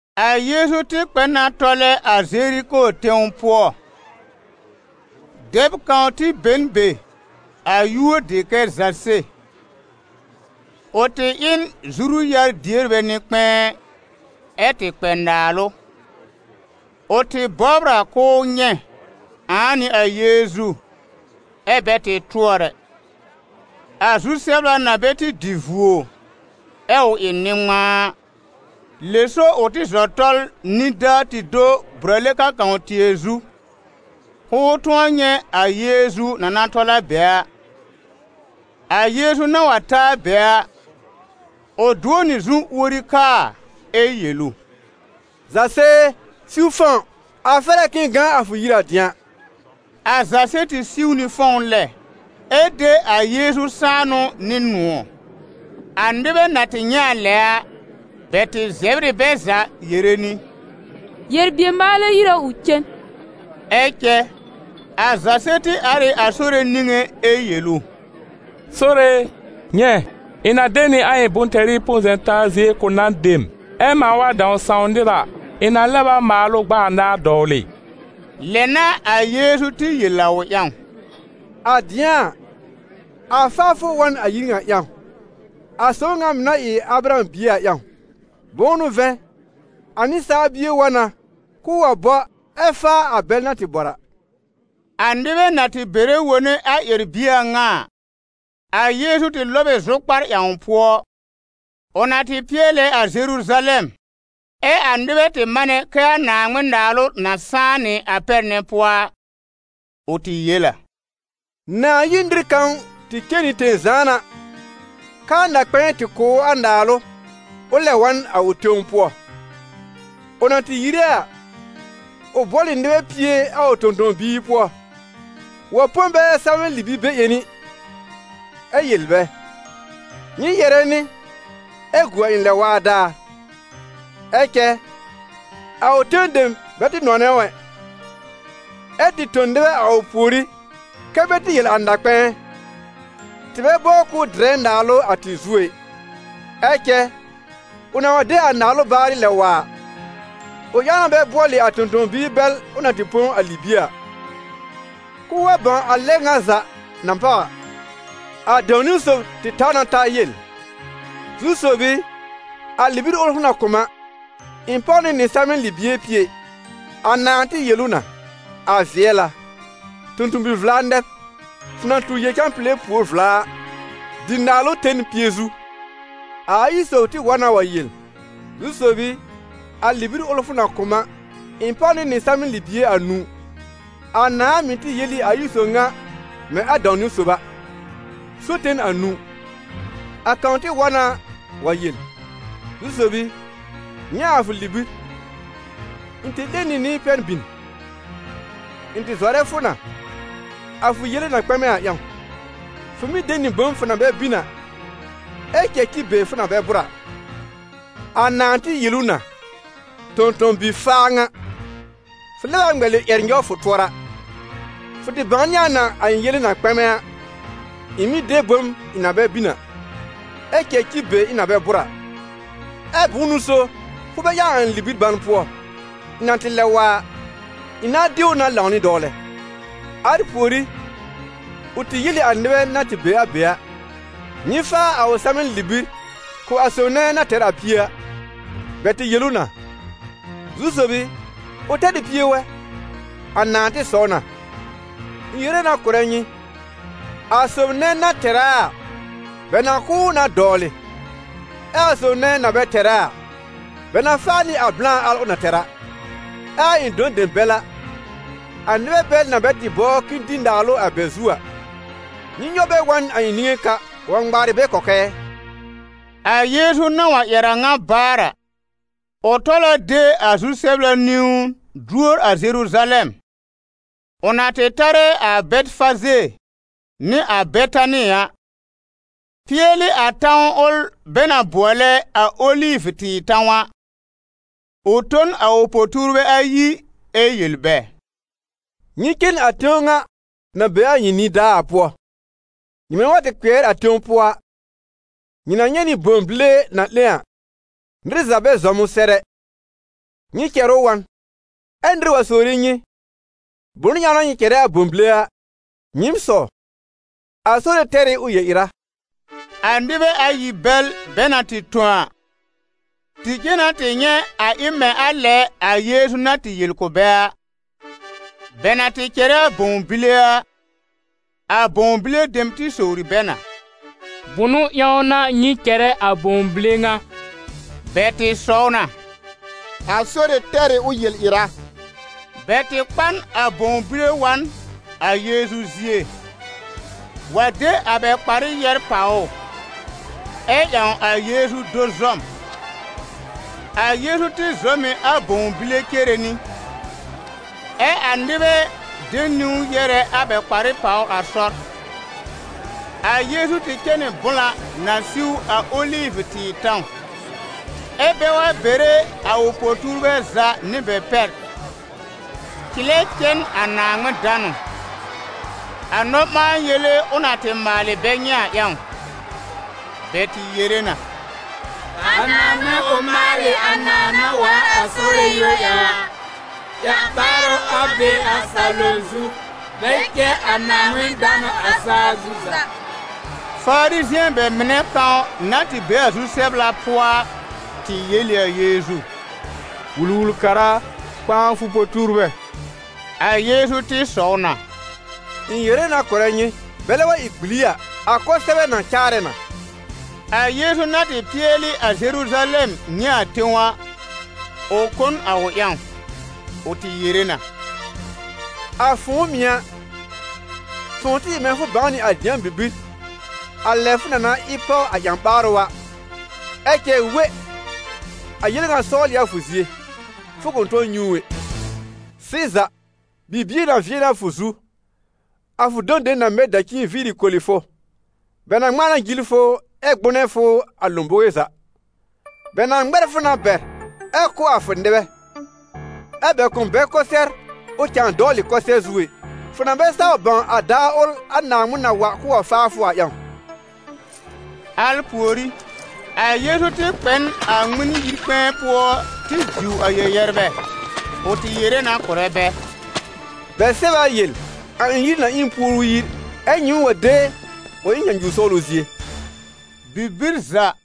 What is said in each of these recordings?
A Yeezu tɩ kpɛ na tɔlɛ a Zeriko tẽw pʋɔ. Dɛb kãw tɩ be n be, a yúor dɩ kɛ Zase. Ʋ tɩ ɩ n zuru-yar-dierbɛ nɩ-kpɛ̃ɛ, ɛ tɩ kpɛ naalʋ. Ʋ tɩ bɔbr a k'ʋʋ nyɛ̃ ãa n'ɩ a Yeezu, ɛ́ bɛ tɩ tʋɔr ɛ, a zu-sɛbla na bɛ tɩ dɩ vuo, ɛ ʋ ɩ nɩ-ŋmãa a. Lɛ so ʋ tɩ zɔ tɔl nidaa tɩ do brale-kãkã-tɩɛ zu, k'ʋʋ tʋ̃ɔ nyɛ̃ a Yeezu na na tɔl a be a. A Yeezu na wa ta a be a, ʋ dʋ̃ɔ nɩ zu uori kaa ɛ yel ʋ: «Zase e, siw fɔ̃w, a fɛr a k'ɩ̃ɩ gã a fʋ yir a dɩ̃a.» A Zase tɩ siw nɩ fɔ̃w lɛ, ɛ de a Yeezu sãanʋ nɩ nʋ̃ɔ̀. A nɩbɛ na tɩ nyɛ̃ a lɛ a, bɛ tɩ zɛbr ɩ bɛ za yere nɩ: «Yel-bier-maalɛ yir a ʋ cen.» Ɛ cɛ a Zase tɩ ar ɩ a Sore niŋé ɛ yel ʋ: «Sore e, nyɛ̃, ɩ̃ na de nɩ a ɩ̃ bʋ̃-tɛrɩ põ-zɛ̃-taa zie kʋ̀ nan dem, ɛ mãa wa dãw sãw nɩr a, ɩ̃ na lɛb a maal ʋ gb'a anaar dɔwlɩ.» Lɛ n'a a Yeezu tɩ yel a ʋ ƴãw: «A dɩ̃a a, a faafʋ wa n a yir ŋa ƴãw, a sob ŋa mɩ̀ na ɩ Abraham bie a ƴãw. Bʋ̃ʋ n'ʋ vɛ̃, a Nɩsaal Bie wa na k'ʋʋ wa bɔ, ɛ́ faa a bɛl na tɩ bɔr a.» A nɩbɛ na tɩ bɛrɛ wone a ƴɛr-bie a ŋa a, a Yeezu tɩ lɔb ɩ zʋkpar ƴãw pʋɔ, ʋ na tɩ pɩɛlɛ a Zeruzalɛm, ɛ a nɩbɛ tɩ manɛ kɛ a Naaŋmɩn-Naalʋ na sãá nɩ a pɛr nɛ pʋɔ a. Ʋ tɩ yel a: «Nãà yir nɩr kãw tɩ cen nɩ tẽ-zãana, k'aa na-kpɛ̃ɛ tɩ kʋ̀ ʋ a naalʋ ʋ lɛb wa n a ʋ tẽw pʋɔ. Ʋ na tɩ yire a, ʋ bʋɔl ɩ nɩbɛ pie a ʋ tõ-tõ-biir pʋɔ, wa põ bɛ salmɛ̃-libi-be-ƴẽni ɛ yel bɛ: ‹Nyɩ yɛ̀rɛ nɩ ɛ gu a ɩ̃ lɛ-waa daar.› Ɛ cɛ a ʋ tẽw dem bɛ tɩ nɔnɛ ʋ ɛ, ɛ tɩ tõ nɩbɛ a ʋ pùorí kɛ́ bɛ tɩ yel a na-kpɛ̃ɛ: ‹Tɩ bɛ bɔbr k'ʋʋ dɩrɛ naalʋ a tɩ zu ɛ.› Ɛ cɛ, ʋ na wa de a naalʋ baarɩ lɛb wa a, ʋ ƴãw na bɛ bʋɔlɩ a tõ-tõ-biir bɛl ʋ na tɩ põ a libie a, k'ʋʋ wa bãw a lɛ ŋa za na páw a. A dãw niwn-sob tɩ taw na ta yel: ‹Zu-sob i, a libir ʋl fʋ na kʋ̀ m a, ɩ̃ páw nɩ nɩ salmɛ̃-libie pie.› A nãà tɩ yel ʋ na: ‹A vɩɛl a, tõ-tõ-bi-vla nɛ b! Fʋ na tu yel-cãpile pùor vla a, dɩ naalʋ ten pie zu.› A ayi sob tɩ wa na wa yel: ‹Zu-sob i, a libir ʋl fʋ na kʋ̀ m a, ɩ̃ páw nɩ nɩ salmɛ̃-libie anũu.› A nãà mɩ̀ tɩ yel ɩ a ayi sob ŋa mɛ̃ a dãw-niwn sob a: ‹So ten anũu.› A kãw tɩ wa na wa yel: ‹Zu-sob i, nyɛ̃ a fʋ libir, ɩ̃ tɩ 'lẽ nɩ nɩ pɛn bin. Ɩ̃ tɩ zɔrɛ fʋ na, a fʋ yele na kpɛmɛ a ƴãw: fʋ mɩ́ de nɩ bom fʋ na bɛ bin a, ɛ́ cɛ̀ ci be fʋ na bɛ bʋ̀r a.› A nãà tɩ yel ʋ na: ‹Tõ-tõ-bi-faa ŋa, fʋ lɛb a ŋmɛlɩ ƴɛr nyɔw fʋ tʋɔra. Fʋ tɩ bãwnɩ a na a ɩ̃ yele na kpɛmɛ a, ɩ̃ mɩ́ de bom ɩ̃ na bɛ bin a, ɛ́ cɛ̀ ci be ɩ̃ na bɛ bʋ̀r a, ɛ bʋ̃ʋ n'ʋ so fʋ bɛ ƴãw a ɩ̃ libir ban pʋɔ? Ɩ̃ na tɩ lɛb wa a, ɩ̃ nãa de ʋ na lãw nɩ dɔwlɛ.› Al pùorí, ʋ tɩ yel ɩ a nɩbɛ na tɩ be a be a: ‹Nyɩ faa a ʋ salmɛ̃-libir kʋ̀ a sob nɛ na tɛr a pie a.› Bɛ tɩ yel ʋ na: ‹Zu-sob i, ʋ tɛr ɩ pie wɛ!› A nãà tɩ sɔw na: ‹Ɩ̃ yere na kʋ̀rɛ nyɩ: a sob nɛ na tɛr a a, bɛ na kʋ̀ ʋ na dɔwlɩ, ɛ a sob nɛ na bɛ tɛr a a, bɛ na faa nɩ a blã al ʋ na tɛr a. Ɛ a ɩ̃ dɔ̃ dem bɛl a, a nɩbɛ bɛl na bɛ tɩ bɔbr k'ɩ̃ɩ dɩ naalʋ a bɛ zu a, nyɩ nyɔw bɛ wa n a ɩ̃ niŋé ka wa ŋmaarɩ bɛ kɔkɛɛ.›» A Yeezu na wa ƴɛr a ŋa baar a, ʋ tɔl a de a zu-sɛbla niwn duor a Zeruzalɛm. Ʋ na tɩ tarɛ a Bɛtɩfaze nɩ a Betani a, pɩɛlɩ a tãw ʋl bɛ na bʋɔlɛ a Olivʋ-tɩɩr tãw a, ʋ tõ n a ʋ po-tuurbɛ ayi ɛ yel bɛ: «Nyɩ cen a tẽw ŋa na be a nyɩ nidaa a pʋɔ. Nyɩmɛ wa tɩ kpɩɛr a tẽw pʋɔ a, nyɩ na nyɛ̃ nɩ bõw bile na 'lẽ a, nɩr za bɛ zɔm ʋ sɛr ɛ, nyɩ cɛr ʋ wa n. Ɛ́ nɩr wa sowre nyɩ: ‹Bʋnʋ ƴãw n'a nyɩ cɛrɛ a bõw bile a?› Nyɩɩm sɔw: ‹A Sore tɛr ɩ ʋ yel-ɩra.›» A nɩbɛ ayi bɛl bɛ na tɩ tõ a, tɩ cen na tɩ nyɛ̃ a ɩ mɛ̃ a lɛ a Yeezu na tɩ yel kʋ̀ bɛ a. Bɛ na tɩ cɛrɛ a bõw bile a, a bõw bile dem tɩ sowri bɛ na: «Bʋnʋ ƴãw n'a nyɩ cɛrɛ a bõw bile ŋa?» Bɛ tɩ sɔw na: «A Sore tɛr ɩ ʋ yel-ɩra.» Bɛ tɩ kpa n a bõw bile wa n a Yeezu zie, wa de a bɛ kparɩ yɛ́r pàw ʋ, ɛ ƴãw a Yeezu do zɔm. A Yeezu tɩ zɔm ɩ a bõw bile cere nɩ, ɛ a nɩbɛ de niwn yɛ́rɛ a bɛ kparɩ pàwr a sɔr. A Yeezu tɩ cɛ nɩ blã na siw a Olivʋ-tɩɩr tãw, ɛ́ bɛ wa bere a ʋ po-tuurbɛ za nɩ bɛ pɛr, cɩlɛ cɛ n a Naaŋmɩn danʋ, a nɔ-ɓãa-yele ʋ na tɩ maalɩ bɛ nyɛ̃ a ƴãw. Bɛ tɩ yere na: «A Naaŋmɩn, ʋ maalɩ a nãà na waar a Sore yúor ƴãw a! Ƴã-ɓaarʋ, a be a salom zu, bɛ cɛ a Naaŋmɩn danʋ a saa zu za!» Farizɩ̃ɛ bɛ mɩnɛ kãw na tɩ be a zu-sɛbla pʋɔ a, tɩ yel ɩ a Yeezu: «Wul-wul-kara a, kpãa a fʋ po-tuurbɛ!» A Yeezu tɩ sɔw na: «Ɩ̃ yere na kʋ̀rɛ nyɩ, bɛlɛ wa ɩ gbili a, a kʋsɛbɛ na caarɛ na.» A Yeezu na tɩ pɩɛlɩ a Zeruzalɛm nyɛ̃ a tẽw a, ʋ kõ n a ʋ ƴãw. Ʋ tɩ yere na: «A fʋ̃ʋ mɩ̀ a, fʋ̃ʋ tɩ ɩ mɛ̃ fʋ bãw nɩ a dɩ̃a bibir a lɛ fʋ na na ɩ páw a ƴã-ɓaarʋ a! Ɛ cɛ we! A yel ŋa sɔwl ɩ a fʋ zie, fʋ kʋ̃ tʋ̃ɔ nyɛ̃ ʋ ɛ. Sɩza, bibie na vɩɛ nɩ a fʋ zu, a fʋ dɔ̃ dem na mɛ dacin viiri koli fʋ, bɛ na ŋmãa na jil fʋ ɛ gbʋ́nɛ́ fʋ a lõbowe za. Bɛ na ŋmɛr fʋ na bɛr ɛ kʋ́ a fʋ nɩbɛ, ɛ́ bɛ kʋ̃ bɛr kʋsɩɛr ʋ cãa dɔwlɩ kʋsɩɛr zu ɛ, fʋ na bɛ saw bãw a daar ʋl a Naaŋmɩn na wa k'ʋʋ wa faa fʋ a ƴãw.» Al pùorí, a Yeezu tɩ kpɛ n a Ŋmɩn-yi-kpɛ̃ɛ pʋɔ tɩ diw a yɛ-yɛrbɛ. Ʋ tɩ yere na kʋ̀rɛ bɛ: «Bɛ sɛb a yel: ‹A ɩ̃ yir na ɩ n puoru yir›, ɛ́ nyɩɩm wa de ʋ ɩ nyãnyuwr sɔwlʋ zie.» Bibir za,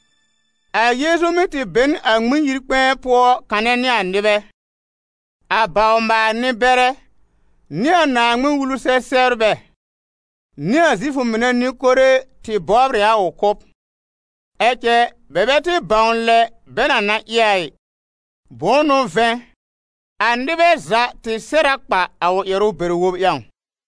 a Yeezu mɩ́ tɩ be n a Ŋmɩn-yi-kpɛ̃ɛ pʋɔ kanɛ nɩ a nɩbɛ. A bawr-maal-nɩ-bɛrɛ, nɩ a Naaŋmɩn-Wulu-sɛ-sɛbrbɛ, nɩ a Zifʋ nɩbɛ nɩ-kore, tɩ bɔbr ɩ a ʋ kʋ́b; ɛ cɛ bɛ bɛ tɩ bãw lɛ bɛ na na ɩ a ɩ; bʋ̃ʋ n'ʋ vɛ̃, a nɩbɛ za tɩ sɛr a kpa a ʋ ƴɛrʋ bɛr-wob ƴãw.